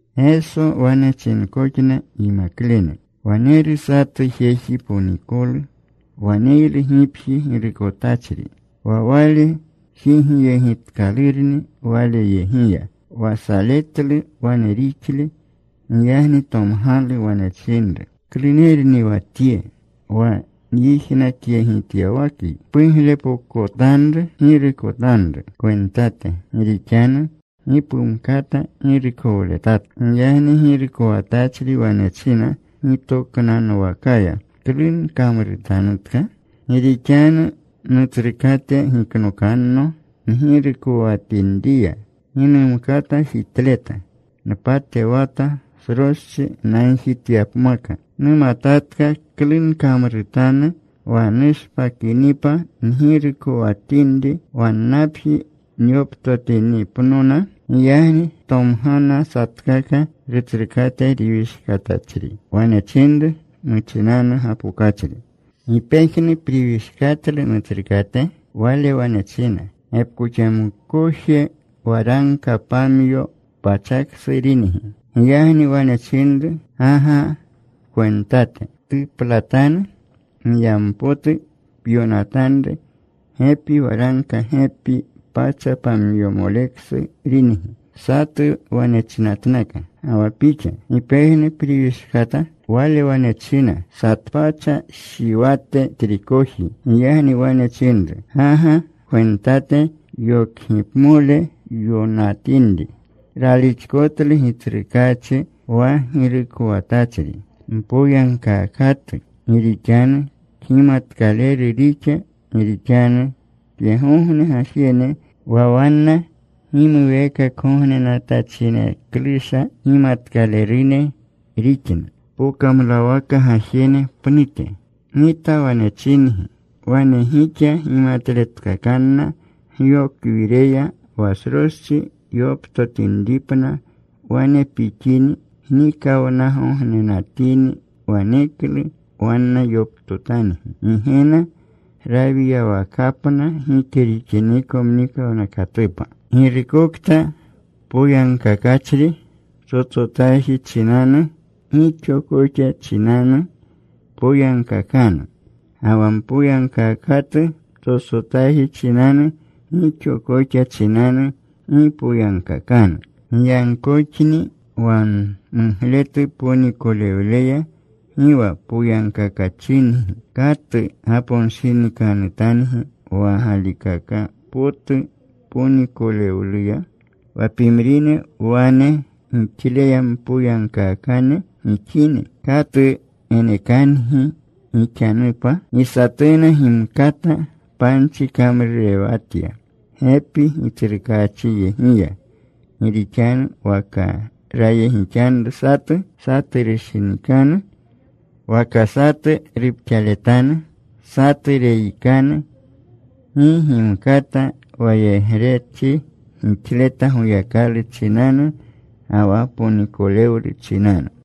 Geso wane chinkoxna yimaklene, “Waneru satu jeji ponikolu. Waneylu gipji girukotachri. Wa wale jigyegitkalurni waleyegiya, wa saletlu wane rixle. Giyagni tomgalu. Wane chinru, ‘¿Klunerni wa tye wa nyijnakyegityawakyi? Puglepokotanru pgirukotanru kwentate. Gi rixanu gi pumkata girukowletatka.’ “Giyagni girukowatachri wane china gitoknanwakaya, ‘¿Klu nkamrutanu? Gi rixanu nutsrukate giknokanno ngirukowatinriya. Gi numkata jitleta. Npatewata sroschi nagjityapmaka. Numatatka klu nkamrutanu wa nushpakinipa ngirukowatinri, wannapji yoptotinipnona.’ “Giyagni tomgana satkaka rutsrukate riwishkatachri. Wane chinru muchinanu gapokachri, ‘¿Gi pejnu priwishkatlu nutsrukate?’ “Wale wane china, ‘Gepkoxamkoje waragka pamyo pachaksu ringi.’ “Giyagni wane chinru, ‘Ga ga pkwentate. Ptuplatanu. Giyampotu pyonatanru gepi waragka gepi pacha pamyomoleksu ringi.’ “Satu wane chinatnaka, ‘¿Ga wa pixa? ¿Gi pejnu priwishkata?’ “Wale wane china, ‘Satpacha shiwate trikoji.’ “Giyagni wane chinru, ‘Ga ga pkwentate. Yokgipmole pyonatinri.’ “Ralixkotlu gitsrukaachi wa girukowatachri mpoyagkaakatu, gi rixanu kgimatkaleru rixa. Gi rixanu tyegogne gajene wa wanna gimuweekakgognenatachineklusha kgimatkalerune rixna pokamlawaka gajene pnute. Gita wane chingi, wane gixa gimatletkakanna gyokwireya, wa sroschi yoptotinripna. Wane pixini gnikawnagognenatini, waneklu wanna yoptotangi Gigena rawiyawakapna gike rixiniko mnikawnakatupa. “Girukokta poyagkakachri ptsotsotaji chinanu, gixo koxa chinanu poyagkakanu. Ga wa mpoyagkaakatu ptsotsotaji chinanu, gixo koxa chinanu gi poyagkakanu. Giyagkoxni wa mugletu ponikolewleya gi wa poyagkakachingi, ¿katu gaponshinikanutangi wa galikaka potu ponikolewluya? Wa pimrine wane gixleya mpoyagkaakane gixini, ¿katu genekangi gixanupa? “Gi satuna gimkata panchi kamrurewatya gepi gitsrukaachinyegiya, gi rixanu waka rayegixanru satu, satu rushinikanu; waka satu rupxaletanu, satu reyikanu. Gi gimkata wayegrechri gixleta Goyakalu chinanu ga wa ponikowlu chinanu.”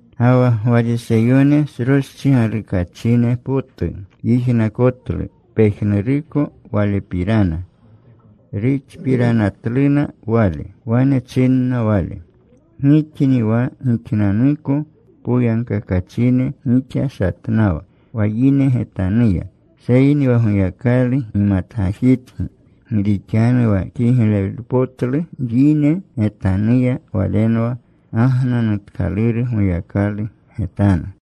Ga wa Gwariseyone sroschi galukachine potu yijnakonatlu pejnuruko Walepirana. Ruxpiranatluna Wale. Wane chinna Wale, “Gixni wa gixnanuko poyagkakachine gixashatnawa wa yine getanuya. Seyni wa Goyakalu gimatgajitgi. Gi rixanu wa kiglepotlu yine getanuya, walenwa gagnanutkaluru Goyakalu getanu.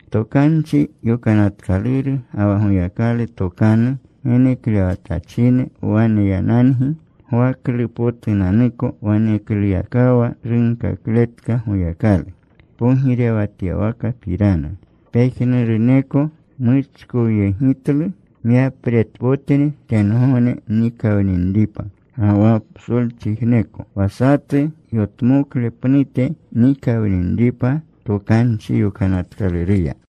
“Tokanchi Yokanatkaluru ga wa Goyakalu tokanu geneklewatachine waneyanangi Gwaklupotunanuko. Wanekluyakawa runkakletka Goyakalu pogirewatyawakapirana. Pejnuruneko muchkowyegitlu. Myapretpotni tengogne nikawninripa ga wa psolchijneko, wa satu yotmokle pnute nikawninripa Tokanchi Yokanatkaluruya.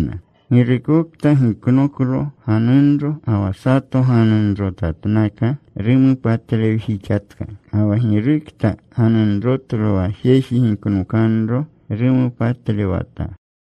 “Girukokta giknoklo ganunro ga wa sato ganunrotatnaka, rumopatlewjixatka. Ga wa girukta ganunrotlo wa jeji giknokanro rumopatlewata.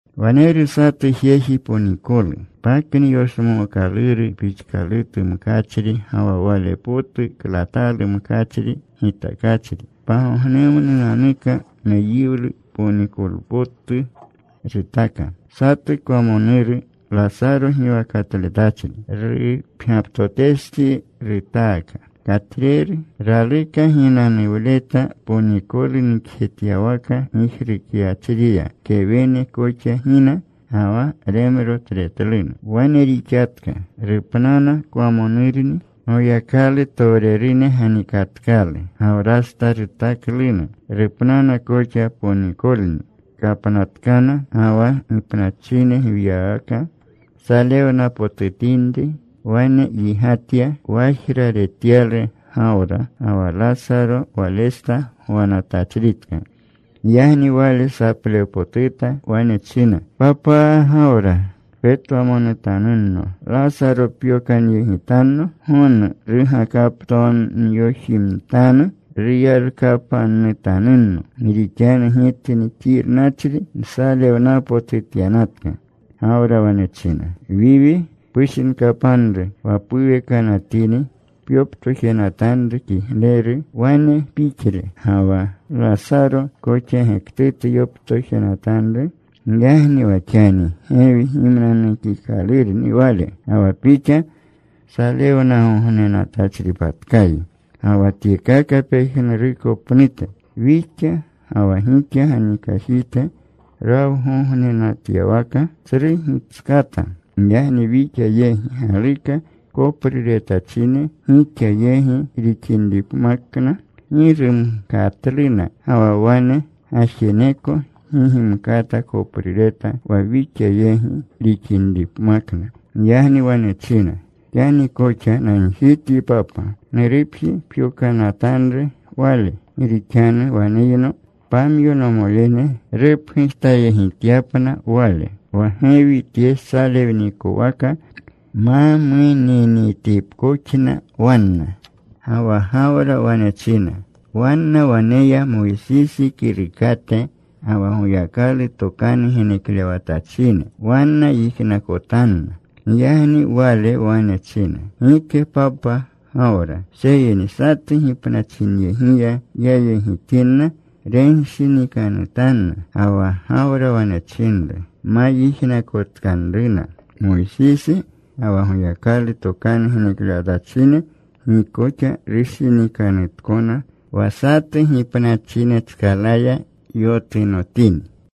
“Waneru satu jeji ponikolu. Pakni yoshmookaluru pixkalutu mkachri ga wa wale potu klatalu mkachri gitakachri. Pagognemnunanuka meyiwlu ponikpoturu rutaka. Satu kwamonuru, Lasaro giwakatletachri, rupgyaptotestsi rutaaka. Katreru. Raluka ginanuwleta ponikolu nikjetyawaka gijrukyachriya. Kewene koxa gina. Ga wa remrotretluna. “Wane rixatka. Rupnana kwamonurni. Goyakalutowrene ganikatkalu. Gawrasta rutakluna. Rupnana koxa ponikolni. Kapnatkana. Ga wa gipnachine gwiywaka salewnapotutinri, wane yigatya. Wajra retyalu Gawra, ga wa Lasaro walesta gwanatachritka. Giyagni wale saplewpotuta. Wane china, ‘¡Papa Gawra, petwamonutanno! Lasaro pyokanyegitanno, gonu rugakaptomyojimtanu. Ruyalkapannutanunno. Gi rixanu tye xirnachri nsalewnapotutyanatka.’ “Gawra wane china, ‘Wiwi, pushinkapanru wa puwekanatini pyoptojenatanru kigleru wane pixle. Ga wa Lasaro koxa gektutu yoptojenatanru. Giyagni wa xani gewi gimnanukikalurni wale, ga wa pixa salewnagognenatachripatkayi. Ga wa tyekaka pejnuruko pnute, wixa ga wa gixa ganikajite rawgognenatyawaka tsru gitskata. Giyagni wixa yegi galuka kopruretachine gixa yegi rixinripmakna, gi rumkatluna. Ga wa wane gajeneko gi gimkata koprureta wa wixa yegi rixinripmakna.’ “Giyagni wane china, ‘Xani koxa nagjityi, papa. Nurupji pyokanatanru wale. Gi rixanu waneyno pamyo nomolene. Rupgujtayegityapna wale, wa gewi tye salewnikowaka ma muninitipkoxna wanna.’ “Ga wa Gawra wane china, ‘Wanna waneya Moysisi kirukate ga wa Goyakalu tokanu geneklewatachine. Wanna yijnakotanna.’ “Giyagni wale wane china, ‘Gike, papa Gawra, seyni satu gipnachinyegiya yayegitinna, renshinikanutanna.’ “Ga wa Gawra wane chinru, ‘Ma yijnakotkanruna Moysisi ga wa Goyakalu tokanu geneklewatachine, gi koxa rushinikanutkona wa satu gipnachinetskalaya yotunotini.’”